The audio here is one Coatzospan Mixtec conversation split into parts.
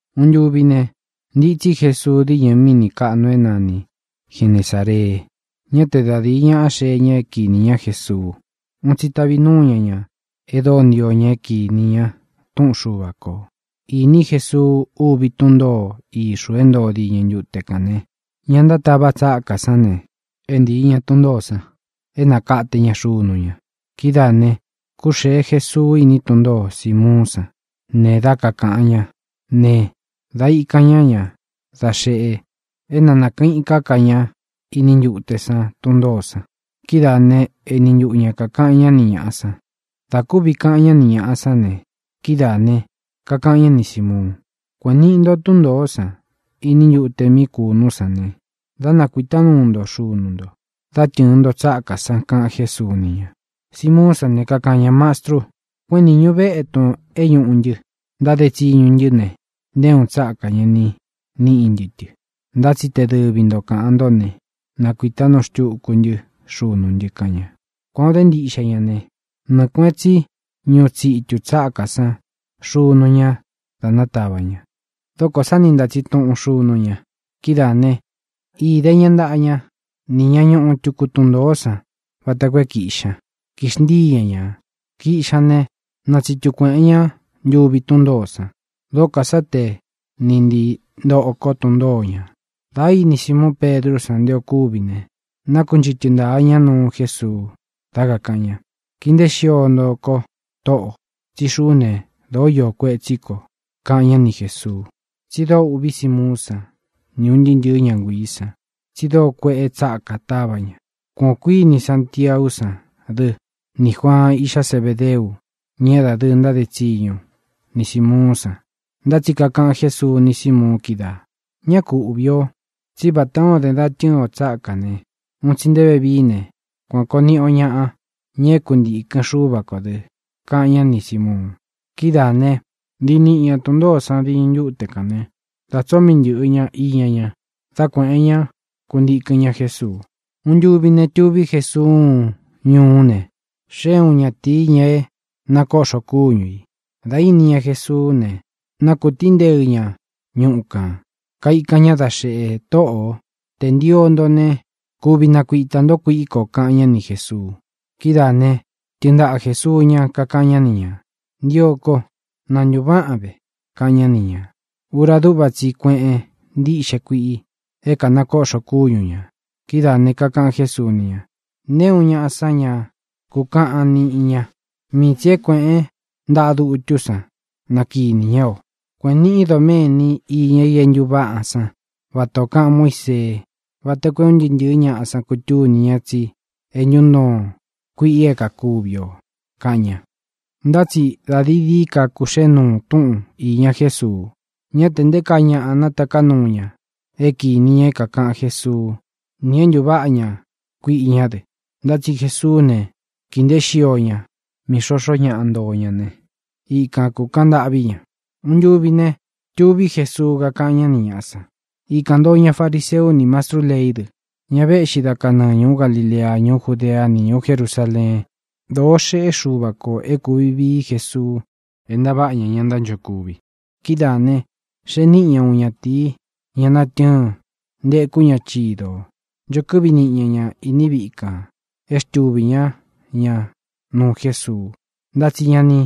Uun ntuvi ne, ntitsí Jesuu díñɨ míni kāꞌnu é nani Genesāree. Ñá te da dīi ñáꞌa xee ña é kīni ñá Jesuu. Un tsi tavi núu ña ñā e dóo ntio ña é kīni ña túꞌun Xuva kō. Īní Jesuu úvi tun ntōo íxū é ntoo diñɨ ntute kān ne, ña ntátava tsákā sán ne, é ntii ña tun ntōó san é nakate ña xunu ña. Kidáā ne, kúxēe Jesuu iní tun ntōo Simuún san ne, dā ikan ñá ña da xeꞌe é na nakɨ̄ꞌɨn íka ká ña iní ntute san tun ntōó san. Kidáā né, eni ntuꞌu ña kākaꞌan ñá ni ñāꞌa san. Dā kúvi kaꞌan ñá ni ñāꞌa sán ne, kidáā ne, kakaꞌan ñá ni Sīmuun: —Kuēꞌen niꞌi nto tún ntōó san iní ntute mí kūnú san ne, dá nakuītá nuu nto xunu nto, dá tɨ̄ɨn nto tsákā san —kaꞌan Jésuu ni ña. Simuún san ne, kakaꞌan ña: —Mastru, kuéꞌen nīñu vétun é ñūꞌu ntɨ, ntáde tsiñu ntɨ́ ne, nté uun tsákā ña ni níꞌí ntɨ tɨ. Ntá tsi te dɨvi nto kāꞌan ntó ne, nakuītá nuu xtuku ntɨ́ xunú ntɨ —kaꞌan ña. Kuān o dé ntiꞌxe ña ne, nɨɨ kuēꞌen tsí ñuꞌu tsitu tsákā san xunú ña dā nátavā ña. Dókō sá ni ntātsin tuꞌun xunú ña. Kidáā né, īde ña ntaꞌa ña ni ñá ñuꞌu tuku tun ntōó san vata koo é kīꞌxi ña, kixntíi ña ñā. Kīꞌxi ña ne, natsítu kuēꞌen ñá ntuvi tún ntōó san. Dókō sá te ni ntīí ntoko tun ntōó ña. Dā íni Simuun Pedrú san nté ō kúvi ne, nākunchɨ́tɨ ntāa ña nuu Jésuu, dá kakāꞌan ña: —Kii nteé xio nto ko, Tóꞌō, tsí xuꞌú ne, dōó iō kuetsí ko —kaꞌan ñá ni Jēsuu. Tsi dóo ūꞌví Simuún san, ni ūn ntɨɨ́ ntɨ̄ɨ́ ña nguiī san, tsi dóo kueꞌe tsákā táva ña. Kuan ō kuíni Santiaú san dɨ nī Juaan, iꞌxá Zebedeu, ña é dadɨɨ ntáde tsiñu ni Sīmuún san. Ntá tsi kakaꞌan Jésuu ni Símuun kídaā: —Ñá ku uꞌvī o. Tsí vatā o den da tɨ́ɨn o tsákā ne, un tsi nté vevií ne, kuan kōo niꞌi o ñaꞌa, ña é kuntīkɨn Xúva kō dɨ —kaꞌan ñá ni Sīmuun. Kidáā né, ntii niꞌi ña tun ntōó san diñɨ ntute kān né, dā tsóo mii ntɨ̄ꞌɨ ña iña ña, dá kuēꞌen ñá, kuntikɨn ñá Jesuu. Uun ntuvi ne, tuví Jesuu uun ñuú ne, xée uun ñatīi, ña é kanakoꞌxo kúñu ī. Dā íni ña Jesuú ne, nákūtínteɨ ña ñuꞌu kān, kaikan ña dá xeꞌe: —Tōꞌó, tē ntio nto ne, kuvi nakuitā ntó kuiꞌí ko —kaꞌan ñá ni Jēsuu. Kidáa ne, tɨɨn ntaꞌa Jēsuu ñá, kakaꞌan ñá ni ñā: —Ntio ko. ¡Na ntūváꞌan ve! —kaꞌan ñá ni ñā. Ura dúꞌva tsi i kueꞌen ntíꞌxe kuiꞌi é kanakoꞌxo kúñu ñā. Kidáā ne, kakaꞌan Jésuu ni ña: —Nté uun ñaꞌa san ña ku káꞌan niꞌin ña. Mii tsī é kuēꞌén ntaꞌa dutú san na kinī ñá o. Kuēꞌen niꞌin doméni iña i é ntūváꞌan san vata ō kaꞌan Muísee, vata koo é un ntɨɨ́ ntɨ̄ɨ́ ñaꞌa san kutúni ña tsi é ntuntoon kuiꞌi é kākuvi o —kaꞌan ña. Ntá tsi da dií dií ka kūxée nuu túꞌun īña Jésuu. Ñá te nté kaa ñaꞌa nataká nuu ña é kīni ña é kākaꞌan Jésuú nī é ntuváꞌa ña kuiꞌi ñá dɨ. Ntá tsi Jesuú ne, kīi nteé xio ña mí xoxó ñaꞌa ntoo ña ne, ikan kūkaꞌan ntâꞌví ña. Uun ntuvi ne, tuví Jesuu, kakaꞌan ñá ni ñāꞌa san. Ikān ntoo ña fariseu ni mastrú leí dɨ, ña véꞌxi da kanɨɨ ñūú Galilea, ñuú Judeá, ni ñūú Jerusāleen. Dōo xéꞌe Xuva kō é kūvi vií Jesuu é ntaváꞌa ña ña ntánchokuvi. Kidáā ne, xee níꞌi ña uun ñatīi, ña natɨ́ɨn, ntēkú ña chidō. Ncho kɨ́ꞌvi niꞌi ña ña īní viꞌi kan é xtuvī ñá ña nuu Jésuu, ntá tsi ña ni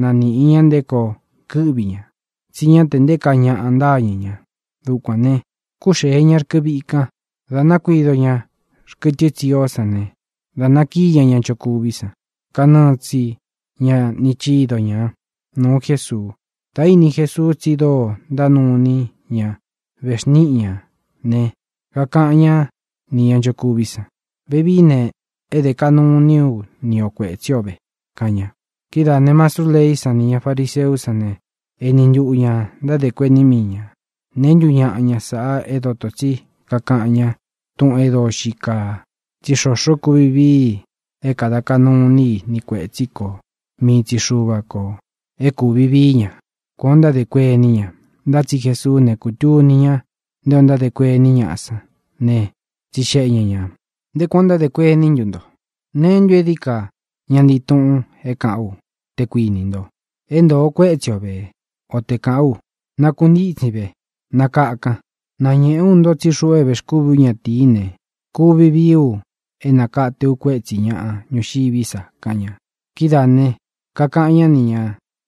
naníꞌi ña nté koo kɨ́ꞌvi ña, tsí ña te nté kaa ñaꞌa ntáñɨ̄ ña. Dukuān ne, kúxēe ña rkɨ víꞌi kan, dā nakuído ña xkɨtɨ tsió san ne, da nákiī ñá ña nchokuví san, kanɨɨ tsi ña ni chido ñā, nuu Jésuu. Dā íni Jesuu tsi dóo ntánuu iní ña vexníꞌi ñā ne, kakaꞌan ñá nī ña nchokuví san: —Vevií ne, é dē kaꞌnu iní u ni o kuētsí o ve —kaꞌan ña. Kidáā ne, mastrú leí san nī ña fariseú san ne, eni ntuꞌu ñā ntádē kuení mii ñā: “¿Neē ntú ñaꞌa ña sāꞌa é dotō tsí kakaꞌan ñá túꞌūn e dóo xii kaa? Tsí xoxo kuvi vií i é kāda kaꞌnu iní i ni kuētsí kō. Mii tsi Xuva kō é kūvi vií ña.” Kuān ó ntádē kuení ña. Ntá tsi Jesuú ne, kūtuni ña nté ō ntádē kuení ñaꞌa san ne, tsixeꞌe ña ñā: —¿Nté kuān ó ntádē kuení ntu nto? ¿Neé ntu é dií ka ña ntii túꞌūn é kāꞌán u, te kuinī nto: “É ntōo kuétsi o vē”, o te kāꞌán u: “Nakuntítsin ve, nakakan”? Nañēꞌé u nto tsí xuꞌu é vēxkúvī ú ñatīí ne, kuvi vií u é nakate u kuétsi ñāꞌa ñuxiví sa —kaꞌan ña. Kidáā ne, kakaꞌan ñá nī ña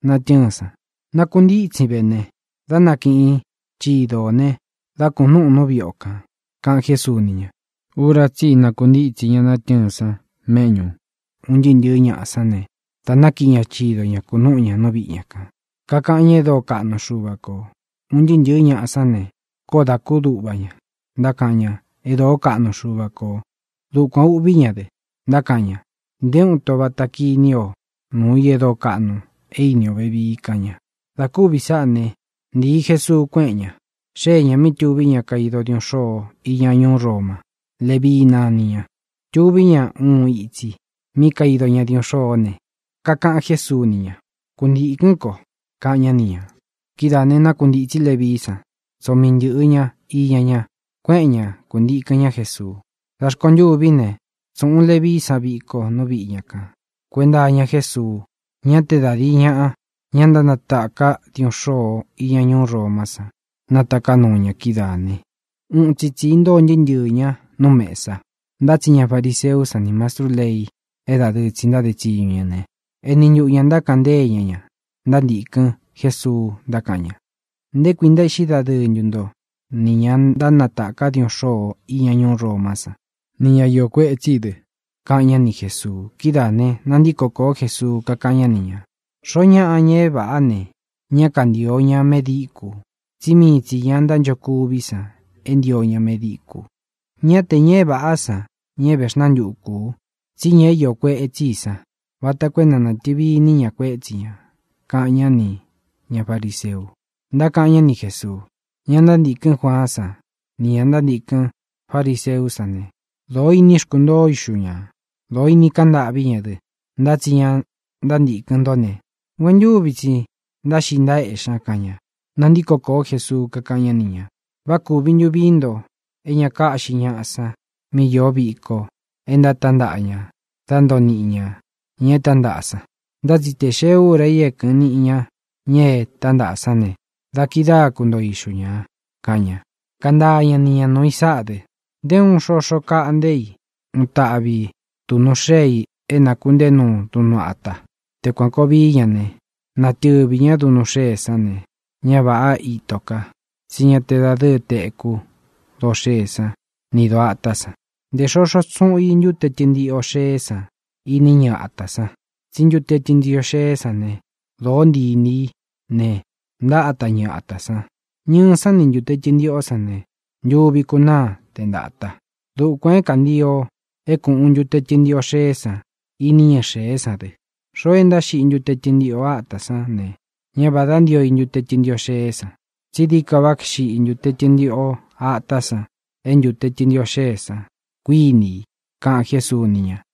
natɨ́ɨn san: —Nākuntítsin vé ne, dá nakiꞌin chido ō ne, dá kūnúꞌūn nú viꞌi o kān —kaꞌan Jésuu ni ña. Ura tsí i nakuntítsi ña natɨ́ɨn san méꞌñu ūn ntɨɨ́ ntɨ̄ɨ́ ñaꞌa san ne, da nákiꞌi ña chido ñā, kunúꞌu ña nú viꞌi ña kān, kakaꞌan ñá e dóo kaꞌnu Xuva kō. Un ntɨɨ́ ntɨ̄ɨ́ ñaꞌa sán ne, koó dā kúduꞌva ña, ntákaꞌan ña e dóo kaꞌnu Xuva kō. Dukuān úꞌvī ñá dɨ, ntákaꞌan ña: —Nté uun ito vata kiní o nuu i e dóo kaꞌnu e íni o vevii —kaꞌan ña. Dā kúvi sáꞌā né, ntīi Jesuu, kuéꞌen ña. Xée ñā mí tuví ña kaido diuꞌun xôo iña ñuú Roma. Levii nani ña. Tuví ña uun itsi mí kaido ña diuꞌun xôó ne, kakaꞌan Jésuu ni ña: —Kuntīkɨ́n ko —kaꞌan ñá ni ñā. Kidáā ne, nákuntītsí Levií san. Tsoo mii ntɨ̄ꞌɨ ña iña ña, kuéꞌen ña, kantikɨ̄n ñá Jesuu. Da rkontûví ne, tsūꞌun Levií san viko nú viꞌi ña kan kuēnta iña Jésuu. Ñá te da dīi ñáꞌa, ña ntánataka diuꞌun xôo iña ñuú Romá san, nátaká nuu ña. Kidáā ne, uun tsi itsi intóo ntɨɨ́ ntɨɨ̄ ña nú mesa. Ntá tsi ña fariseú san ni mastrú lei é dadɨɨ tsi ntáde tsiñu ña ne, eni ntuꞌu ñā ntákaꞌan ntée ña ña ntántīkɨn Jésuu, ntákaꞌan ña: —¿Nté kui ntaéꞌxí dadɨɨ nto nī ña ntánataka diuꞌun xôo iña ñuú Romá san, ni ña iō kuetsí i dɨ? —kaꞌan ñá ni Jēsuu. Kidáā ne, nantíko kōó Jesuu, kakáꞌan ñá ni ñā: —Xoó ñaꞌa, ña é vāꞌá ne, ñá kantīo ña medíkū. Tsí mii tsī ña ntánchokuví san é ntio ña medíkū. Ñá te ña é vāꞌá san ña é vexnantukū u, tsí ña iō kuetsí i san, vata koo é na natɨ̄vi iní ña kuétsi ña —kaꞌan ñá nī ña fariseu. Ntákaꞌan ñá ni Jēsuu: —Ña ntántīkɨn Juaán san nī ña ntántīkɨn fariseú san ne, dōo ini xkuntoo ixu ñā; dōo ini kaꞌan ntâꞌví ña dɨ. Ntá tsi ña ntántīkɨn ntó ne, nguentúvi tsi ntáxiꞌi ntaéꞌxi ña —kaꞌan ña. Nantíko kōó Jesuu, kakáꞌan ñá ni ñā: —¿Vá kūvi ntu vií nto é ña káꞌxi ñaꞌa san mí iō víko e ntatántaꞌa ña da ntóo niꞌi ña ña e tántaꞌa san? Ntá tsi tē xee úra i é kɨꞌɨn niꞌi ña ña e tántaꞌa sán ne, da kidáa kuntoo ixu ñā —kaꞌan ña. Kantaa ña ni ñā nuu i sáꞌa dɨ: —Nté uun xoxo kaꞌnté i uun taꞌvi duꞌnu xée i é nākunteé nuu duꞌnu ata. Te kuan kōo vií ña ne, natɨvī ñá duꞌnu xée san ne, ñá vāꞌá ito ka, tsí ña te dadɨ́ɨ tekú doo xée san nī doo atá san. Ntē xoxo tsuꞌun i ntute tɨntiꞌo xeé san iní ñɨɨ atā san, tsí ntute tɨntiꞌo xeé san ne, dōó ntii inī í ne, ntáta ñɨɨ atā san. Ñɨɨ san ni ntūte tɨntiꞌo sán ne, ntuvi kunáa te ntāta. Dukuān é kantio é kūꞌun ntute tɨntiꞌo xeé san iní ñɨɨ xēé san dɨ. Xoo e ntáxiꞌi i ntute tɨntiꞌo atā sán ne, ñá vādá ntio i ntute tɨntiꞌo xeé san, tsí dií ka váꞌa xiꞌi ntute tɨntiꞌo atā san é ntute tɨntiꞌo xeé san, kuiní i —kaꞌan Jésuu ni ña.